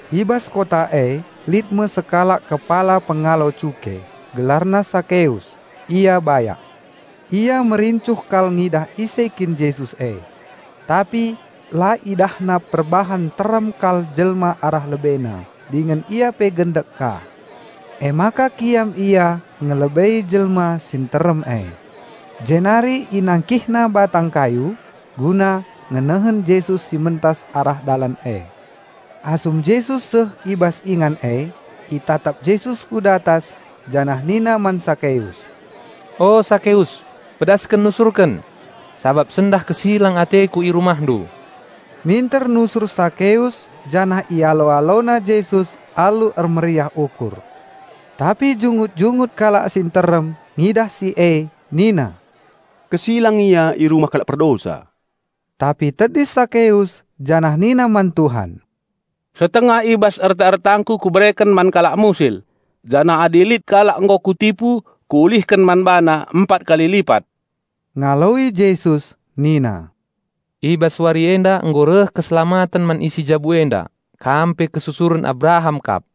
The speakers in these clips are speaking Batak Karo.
I bas kota e lit me sekalak kepala pengalo cuke, gelarna Sakeus. Ia bayak. Ia merincuh kal ngidah ise kin Jesus e. Tapi la idahna perbahan nterem kal jelma arah lebena dingen ia pe gendek ka. Emaka kiam ia ngelebei jelma si nterem e, jenari inangkihna batang kayu, guna ngenehen Jesus si mentas arah dalan e. Asum Jesus seh i bas ingan e, itatap Jesus ku datas janah nina man Sakeus, "O Sakeus pedasken nusurken! Sabap sendah kesilang ateKu i rumahndu." Minter nusur Sakeus janah ialo-alona Jesus alu ermeriah ukur. Tapi jungut-jungut kalak si nterem ngidah si e nina, "Kesilang Ia i rumah kalak perdosa." Tapi tedis Sakeus janah nina man Tuhan, "Setengah i bas erta-ertangku kubereken man kalak musil; janah adi lit kalak nggo kutipu, kuulihken man bana empat kali lipat." Ngaloi Jesus nina, "I bas wari enda nggo reh keselamaten man isi jabu enda. Kam pe kesusuren Abraham kap.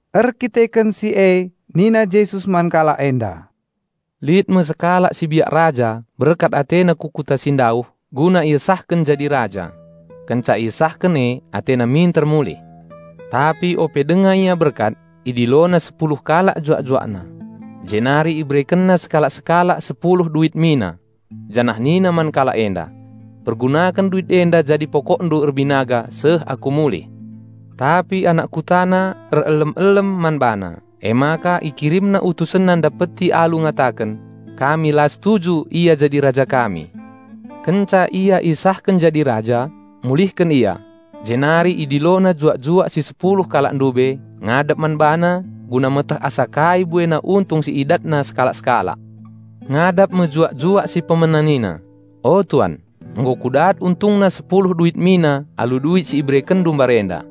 Erkiteken si e nina Jesus man kalak enda, "Lit me sekalak si biak raja berkat atena ku kuta si ndauh guna iesahken jadi raja. Kenca iesahken e atena minter mulih. Tapi ope denga ia berkat, idilona sepuluh kalak juak-juakna. Jenari iberekenna sekalak-sekalak sada duit emas. Janah nina man kalak enda, 'Pergunaken duit enda jadi pokokndu erbinaga seh aku mulih.' Tapi anak kutana erelem-elem man bana, emaka ikirimna utusenna ndapeti alu ngataken, 'Kami la setuju ia jadi raja kami.' Kenca ia iesahken jadi raja, mulihken ia. Jenari idilona juak-juak si sepuluh kalak ndube ngadap man bana guna meteh asa kai buena untung si idatna sekalak-sekalak. Ngadap me juak-juak si pemena nina, 'O, tuan, nggo kudat untungna sepuluh duit emas nari alu duit si iberekenndu mbarenda.'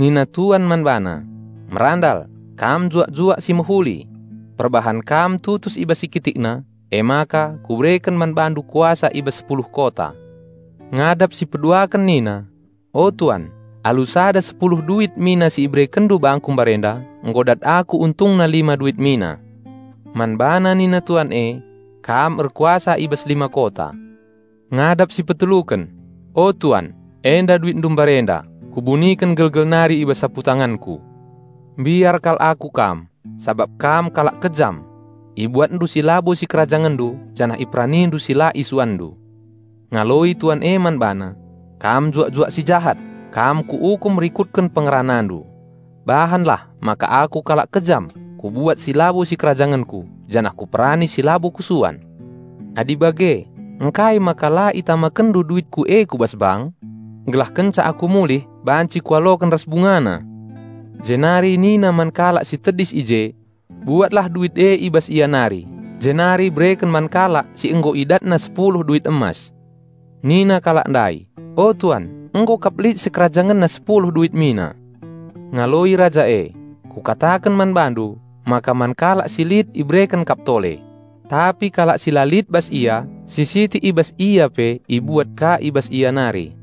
Nina tuan man bana, 'Merandal, kam juak-juak si mehuli! Perbahan kam tutus i bas si kitikna, emaka kubereken man bandu kuasa i bas sepuluh kota.' Ngadap si peduaken nina, 'O tuan alu sada duit emas si iberekenndu bangku mbarenda, nggo dat aku untungna lima duit emas nari.' Man bana nina tuan e, 'Kam erkuasa i bas lima kota.' Ngadap si peteluken, 'O tuan, enda duit emasndu; kubuniken gelgel nari i bas saputanganku. Mbiar kal aku kam, sabap kam kalak kejam. Ibuatndu si labo sikerajangenndu janah iperanindu si la isuanndu.' Ngaloi tuan e man bana, 'Kam juak-juak si jahat! Kam kuukum rikutken pengeranandu. Bahanlah maka aku kalak kejam, kubuat si labo sikerajangenku janah kuperani si labo kusuan. Adi bage, ngkai maka la itamakenndu duitku e ku bas bank? Gelah kenca aku mulih banci kualoken ras bungana.' Jenari nina man kalak si tedis i je, 'Buatlah duit e i bas ia nari, jenari bereken man kalak si nggo idatna sepuluh duit emas.' Nina kalak ndai, 'O tuan, nggo kap lit sikerajangenna sepuluh duit emas.' Ngaloi raja e, 'Kukataken man bandu maka man kalak si lit ibereken kap tole; tapi kalak si la lit, si sitik i bas ia pe ibuat ka i bas ia nari.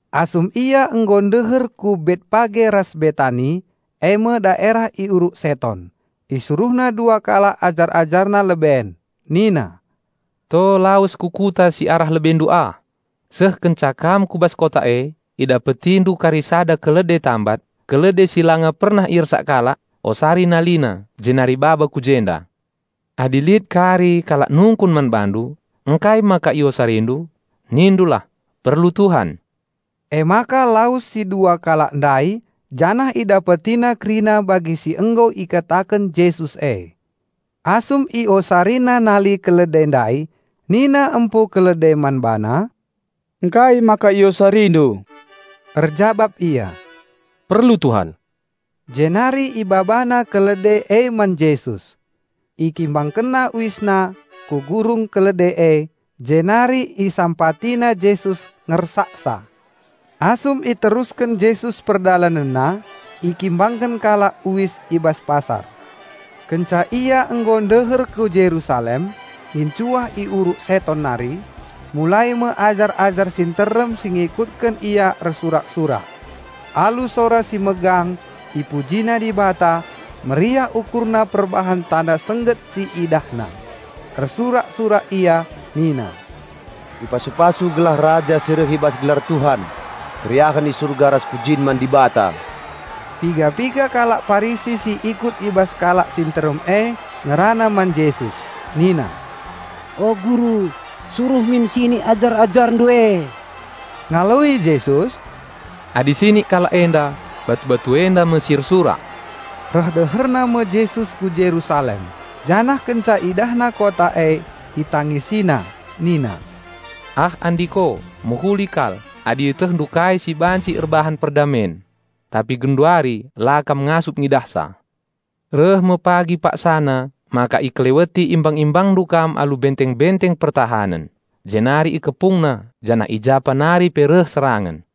Asum Ia nggo ndeher ku Betpage ras Betani, e me daerah i Uruk Seton, IsuruhNa dua kalak ajar-AjarNa leben, nina, "To lawes ku kota si arah lebendu ah. Seh kenca kam ku bas kota e, idapetindu kari sada kalde tambat, kalde si langa pernah iersak kalak. Osari nalina, jenari baba ku jenda. Adi lit kari kalak nungkun man bandu, 'Ngkai maka iosarindu?', nindulah, 'Perlu Tuhan.'" Emaka lawes si dua kalak ndai janah idapetina kerina bagi si nggo ikataken Jesus e. Asum iosarina nali kalde ndai nina empu kalde man bana, "Ngkai maka iosarindu?" Erjabap ia, "Perlu Tuhan." Jenari ibabana kalde e man Jesus. Ikimbangkenna uisna ku gurung kalde e jenari isampatina Jesus ngersaksa. Asum iterusken Jesus PerdalanenNa, ikimbangken kalak uis i bas pasar. Kenca Ia nggo ndeher ku Jerusalem, ngincuah i Uruk Seton nari, mulai me ajar-ajar si nterem si ngikutken Ia ersurak-surak. Alu sora si megang ipujina Dibata, meriah ukurna perbahan tanda sengget si idahna. Ersurak-surak ia nina, "Ipasu-pasu gelah Raja si reh i bas Gelar Tuhan! Keriahen i Surga ras pujin man Dibata!" Piga-piga kalak Parisi si ikut i bas kalak si nterem e ngerana man Jesus nina, "O Guru, suruh min sinik ajar-AjarNdu e." Ngaloi Jesus, "Adi sinik kalak enda, batu-batu enda me si ersurak." Reh deherna me Jesus ku Jerusalem, janah kenca IdahNa kota e ItangisiNa, nina, "Ah andiko, mehuli kal adi ietehndu kai si baci erbahan perdamen. Tapi genduari la kam ngasup ngidahsa! Reh me pagi paksana maka ikeleweti imbang-imbangndu kam alu benteng-benteng pertahanen, jenari ikepungna janah ijapa nari pe reh serangen.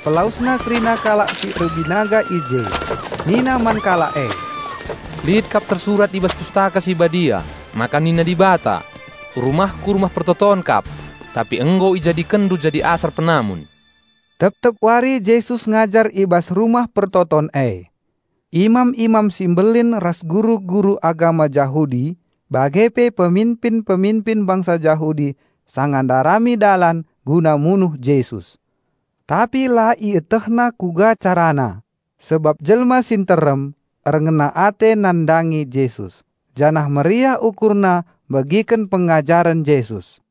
Jenari bengket Jesus ku bas Rumah Pertoton. IpelawesNa kerina kalak si erbinaga i je. Nina man kalak e, "Lit kap tersurat i bas Pustaka Si Badia, maka nina Dibata, 'RumahKu Rumah Pertoton kap.' Tapi nggo ijadikenndu jadi asar penamun." Tep-tep wari Jesus ngajar i bas Rumah Pertoton e. Imam-imam si mbelin ras guru-guru agama Jahudi bage pe peminpin-peminpin bangsa Jahudi sanga ndarami dalan guna munuh Jesus. Tapi la ietehna kuga carana, sabap jelma si nterem erngena ate nandangi Jesus janah meriah ukurna megiken pengajaren Jesus.